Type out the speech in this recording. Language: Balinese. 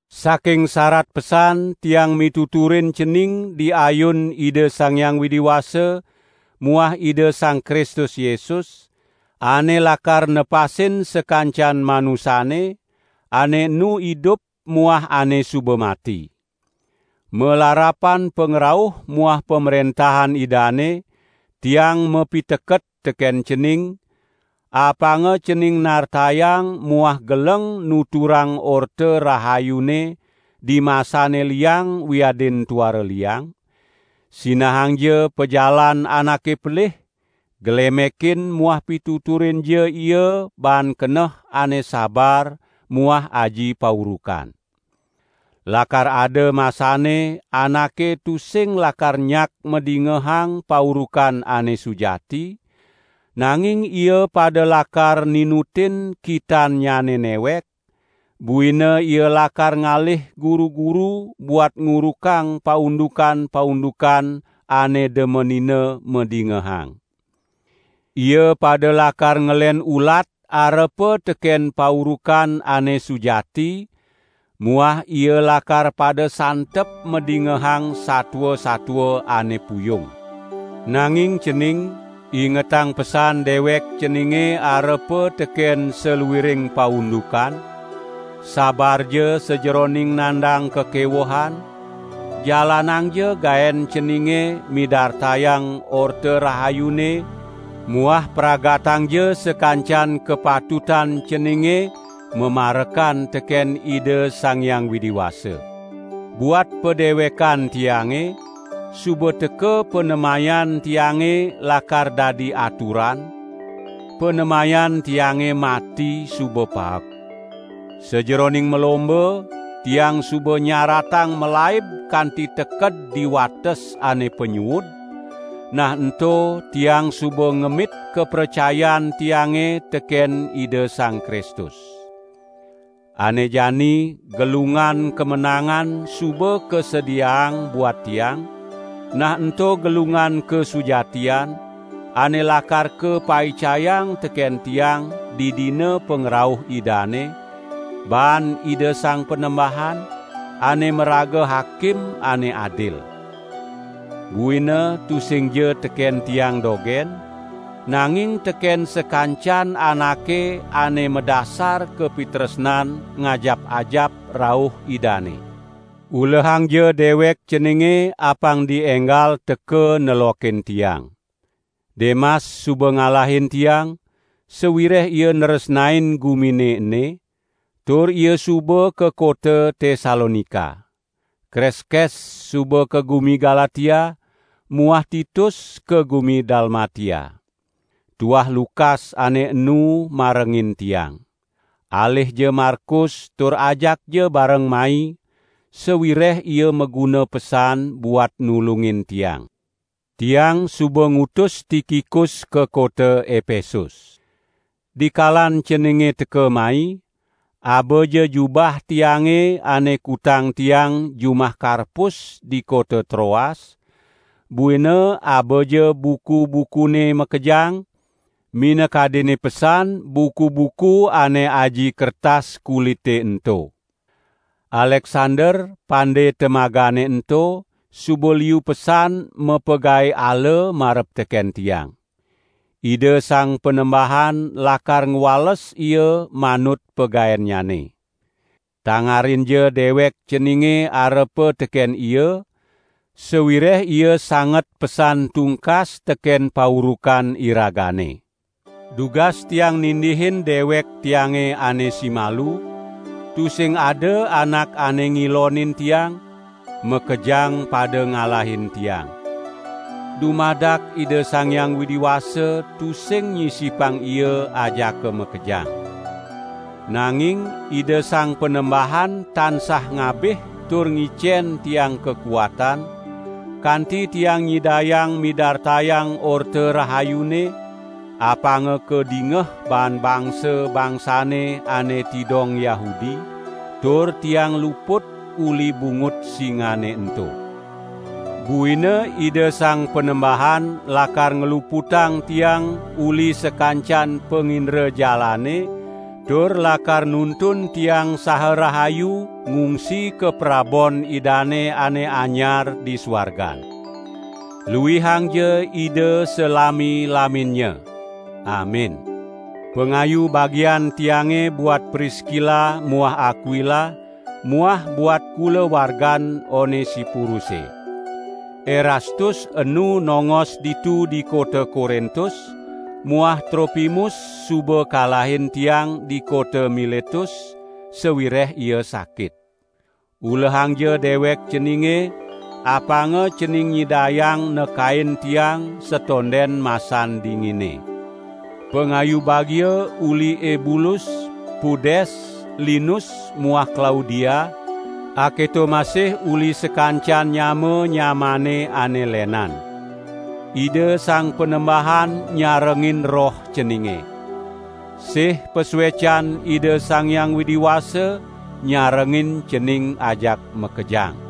Saking sarat pesan tiang mituturin cening di ayun Ida Sang Hyang Widi Wasa muah Ida Sang Kristus Yesus, ane lakar nepasin sakancan manusane, ane enu idup muah ane suba mati. Malarapan pangrauh muah pamrentahan Idane, tiang mapiteket teken cening, apanga cening nartayang muah geleng nuturang Orta Rahayune dimasane liang wiadin tuara liang; sinahangja pajalan anake pelih, glemekin muah pituturinja ia baan keneh ane sabar muah aji paurukan. Lakar ada masanne anake tusing lakar nyak madingehang paurukan ane sujati, nanging ia pada lakar ninutin kitannyane newek, buina ia lakar ngalih guru-guru buat ngurukang paundukan-paundukan ane demenina madingehang. Ia pada lakar ngelen ulat arepa teken paurukan ane sujati muah ia lakar pada santep madingehang satua-satua ane puyung. Nanging cening, ingetang pesan dewek ceninge arepa teken saluiring paundukan; sabarja sajeroning nandang kakewehan, jalanangja gaen ceninge midartayang Orta Rahayune muah pragatangja sakancan kapatutan ceninge mamarekan teken Ida Sang Hyang Widi Wasa. Buat padewekan tiange, suba teka panemayan tiange lakar dadi aturan; panemayan tiange mati suba paek. Sajeroning malomba, tiang suba nyaratang malaib kanti teked di wates ane panyuud, nah ento tiang suba ngemit kapracayan tiange teken Ida Sang Kristus. Ane jani gelungan kamenangan suba kasediaang buat tiang, nah ento gelungan kasujatian, ane lakar kapaicayang teken tiang didina pangrauh Idane, baan Ida Sang Panembahan, ane maraga Hakim ane adil. Buina tusingja teken tiang dogen, nanging teken sakancan anake ane madasar kapitresnan ngajap-ajap rauh Idane. Ulehangja dewek ceninge apang dienggal teka nelokin tiang. Demas suba ngalahin tiang, sawireh ia nresnain gumine ene, tur ia suba ka kota Tesalonika. Kreskes suba ka gumi Galatia muah Titus ka gumi Dalmatia. Tuah Lukas ane enu marengin tiang. Alihja Markus tur ajakja bareng mai, sawireh ia maguna pesan buat nulungin tiang. Tiang suba ngutus Tikikus ka kota Epesus. Dikalan ceninge teka mai, abaja jubah tiange ane kutang tiang jumah Karpus di kota Troas, buina abaja buku-bukune makejang, minakadinne pesan buku-buku ane aji kertas kulite ento. Aleksander, pande temagane ento, suba liu pesan mapagae ala marep teken tiang. Ida Sang Panembahan lakar ngwales ia manut pagaennyane. Tangarinja dewek ceninge arepa teken ia, sawireh ia sanget pesan tungkas teken paurukan iragane. Dugas tiang nindihin dewek tiange ane simalu, tusing ada anak ane ngilonin tiang, makejang pada ngalahin tiang. Dumadak Ida Sang Hyang Widi Wasa tusing nyisipang ia ajaka makejang. Nanging Ida Sang Panembahan tansah ngabih tur ngicen tiang kakuatan, kanti tiang nyidayang midartayang Orta Rahayune, apanga kadingeh baan bangsa-bangsane ane tidong Yahudi; tur tiang luput uli bungut singane ento. Buina Ida Sang Panembahan lakar ngluputang tiang uli sakancan pangindrajalane tur lakar nuntun tiang saha rahayu ngungsi ka Kaprabon Idane ane anyar di suargan. Luihangja Ida salami-laminnya. Amin. Pangayu bagian tiange buat Priskila muah Akwila muah buat kulawargan Onesiporuse. Erastus enu nongos ditu di kota Korintus muah Tropimus suba kalahin tiang di kota Miletus, sawireh ia sakit. Ulehangja dewek ceninge, apanga cening nyidayang nekain tiang satonden masan dingine. Pangayu bagia uli Ebulus, Pudes, Linus muah Klaudia, aketo masih uli sakancan nyama-nyamaane ane lenan. Ida Sang Panembahan nyarengin roh ceninge. Sih pasuecan Ida Sang Hyang Widi Wasa nyarengin cening ajak makejang.